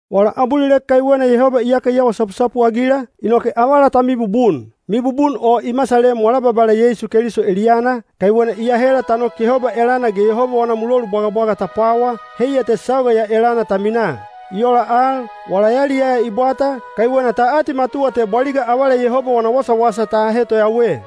Wala abulilek kaiwena Yehoba iyaka i awa sapusapu-agila, inoke avala ta mibubun. Mibubun o i masalem wala Babala Yeisu Keliso eliyana, kaiwena i ahela ta nok Yehoba elana ge Yehoba wana mulolu bwagabwaga ta pwawa, heiya te sauga ya elana ta minaa. I ola al, wala yaliyaya i bwata, kaiwena ta atimatuwa te bwaliga avala Yehoba wana wasawasa ta ahe toyawe.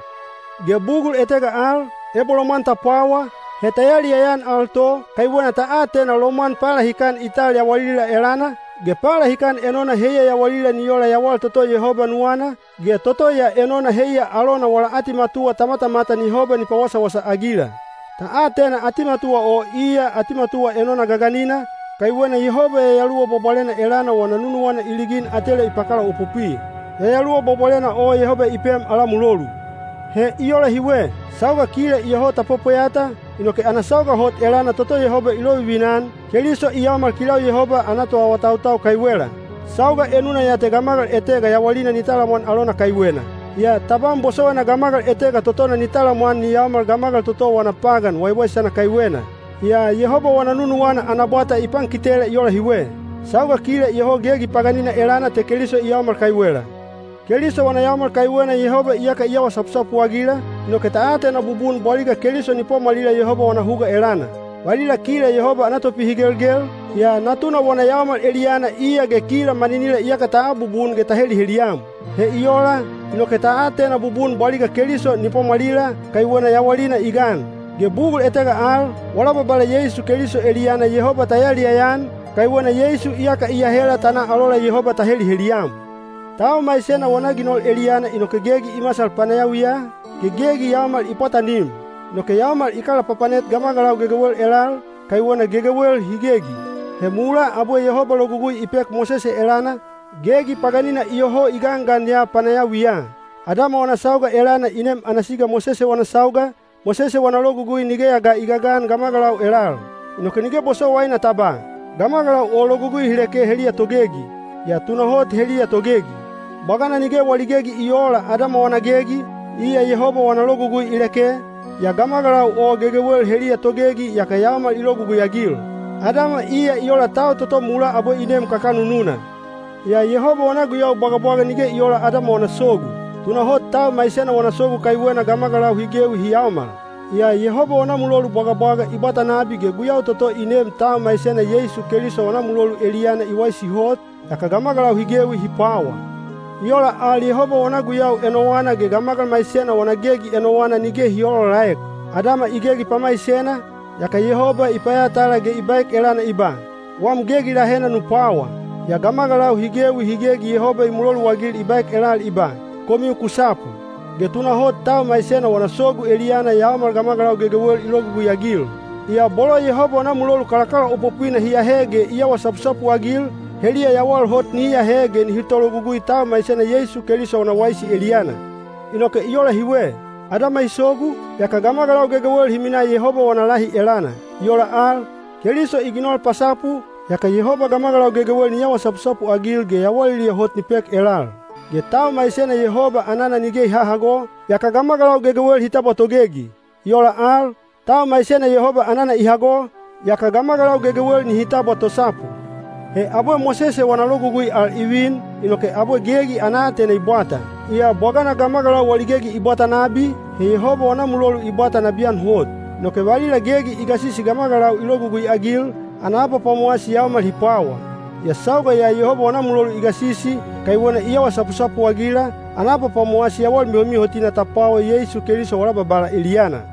Ge bugul etega al, ebo lomwan ta pwawa, he ta yaliyaya-an al to, kaiwena ta atena lomwan palahikan i tal yawalila elana, ge palahikan enona heiya yawalila ni ola yawal toto Yehoba nuwana, ge toto ya enona heiya alona wala atimatuwa ta matamatan Yehoba ni pawasawasa-agila. Ta atena atimatuwa o iya atimatuwa enona gaganina, kaiwena Yehoba Yayaluwa Bwabwalena elana wana nunuwana i ligin atela i pakalaopopwi. Yayaluwa Bwabwalena o Yehoba i pem ala mulolu. He i ola hiwe. Sauga kila iyoho ta pwepweyata, inoke ana sauga hot elana toto Yehoba i lovivina-an, Keliso i yaomal kilau Yehoba ana toawatautau kaiwela. Sauga enuna ya te gamagal etega yawalina ni talamwan alona kaiwena. Yaa tabam bosowaina gamagal etega totona ni talamwan ni yaomal gamagal toto wana pagan waiwaisana kaiwena. Yaa Yehoba wana nunuwana ana bwata i pankitela i ola hiwe: sauga kila iyoho gegi paganina elana te Keliso i yaomal kaiwela. Keliso wana yaomal kaiwena Yehoba iyaka i awa sapusapu-agila, inoke ta atena bubun bwaliga Keliso ni pwamwalila Yehoba wana huga elana. Valila kila Yehoba ana topihigelgel, yaa Natuna wana yaomal eliyana iya ge kila maninila iyaka ta abubun ge ta heliheliyam. He i ola, inoke ta atena bubun bwaliga Keliso ni pwamwalila, kaiwena yawalina i gan. Ge bugul etega al, wala Babala Yeisu Keliso eliyana Yehoba ta yaliyaya-an, kaiwena Yeisu iyaka i ahela ta na alola Yehoba ta heliheliyam. Tau maisena wana ginol eliyana inoke gegi i masal panayawiya, ge gegi yaomal i pwatanim. Inoke yaomal i kalapapanet gamagalau gegewel elal, kaiwena gegewel hi gegi. He mulaa abwe Yehoba logugui i pek Mosese elana, gegi paganina iyoho i gangan ya panayawiya. Adama wana sauga elana i nem ana siga Mosese wana sauga, Mosese wana Logugui nigeya ga i gagan gamagalau elal. Inoke nige bosowaina ta ba, “Gamagalau o logugui hi leke heliya togegi.” Yaa tunahot heliya togegi. Bwagana nige wali gegi i oola Adama wana gegi, iya Yehoba wana logugui i leke, yaa gamagalau o gegewel heliya togegi yaka yaomal i logugui-agil. Adama iya i ola tau toto mulaa abwe i nem kakanununa. Yaa Yehoba wana guyau bwagabwaga nige i oola Adama wana sogu. Tunahot tau maisena wana sogu kaiwena gamagalau hi gewi hi yaomal. Yaa Yehoba wana mulolu bwagabwaga i bwata nabi ge guyau toto i neem tau maisena Yeisu Keliso wana mulolu eliyana i waisi hot, yaka gamagalau hi gewi hi pwawa. I ola al Yehoba wana guyau enowana ge gamagal maisena wana gegi enowana nige hi oolaolaek. Adama i gegi pamaisena, yaka Yehoba i payatala ge i baek elana i ba, “Wam gegi lahena nu pwawa.” Yaa gamagalau hi gewi hi gegi Yehoba i muloluagil i baek elal i ba, “Komiu ku sapu.” Ge tunahot tau maisena wana sogu eliyana yaomal gamagalau gegewel i logugui-agil. Yaa bolo Yehoba wana mulolu kalakalaopopwina hi ahe ge i awa sapusapu-agil, heliya yawal hot nihi ahe ge nihi tologugui tau maisena Yeisu Keliso wana waisi eliyana. Inoke i ola hiwe. Adama i sogu, yaka gamagalau gegewel hi minaa Yehoba wana lahi elana. I ola al, Keliso i ginol pasapu, yaka Yehoba gamagalau gegewel ni awa sapusapu-agil ge yawaliliya hot ni pek elal. Ge tau maisena Yehoba anana nige i hahago, yaka gamagalau gegewel hi tabwa togegi. I ola al, tau maisena Yehoba anana i hago, yaka gamagalau gegewel nihi tabwa tosapu. He abwe Mosese wana Logugui al i vin, inoke abwe gegi ana aatena i bwata. Yaa bwagana gamagalau wali gegi i bwata nabi, he Yehoba wana mulolu i bwata nabiyan hot. Inoke valila gegi i gasisi gamagalau i logugui-agil, ana abapwamowasi yaomal hi pwawa. Yaa sauga ya Yehoba wana mulolu i gasisi, kaiwena i awa sapusapu-agila, ana abapwamowasi yawal mihomihotina ta pwawa Yeisu Keliso wala Babala eliyana.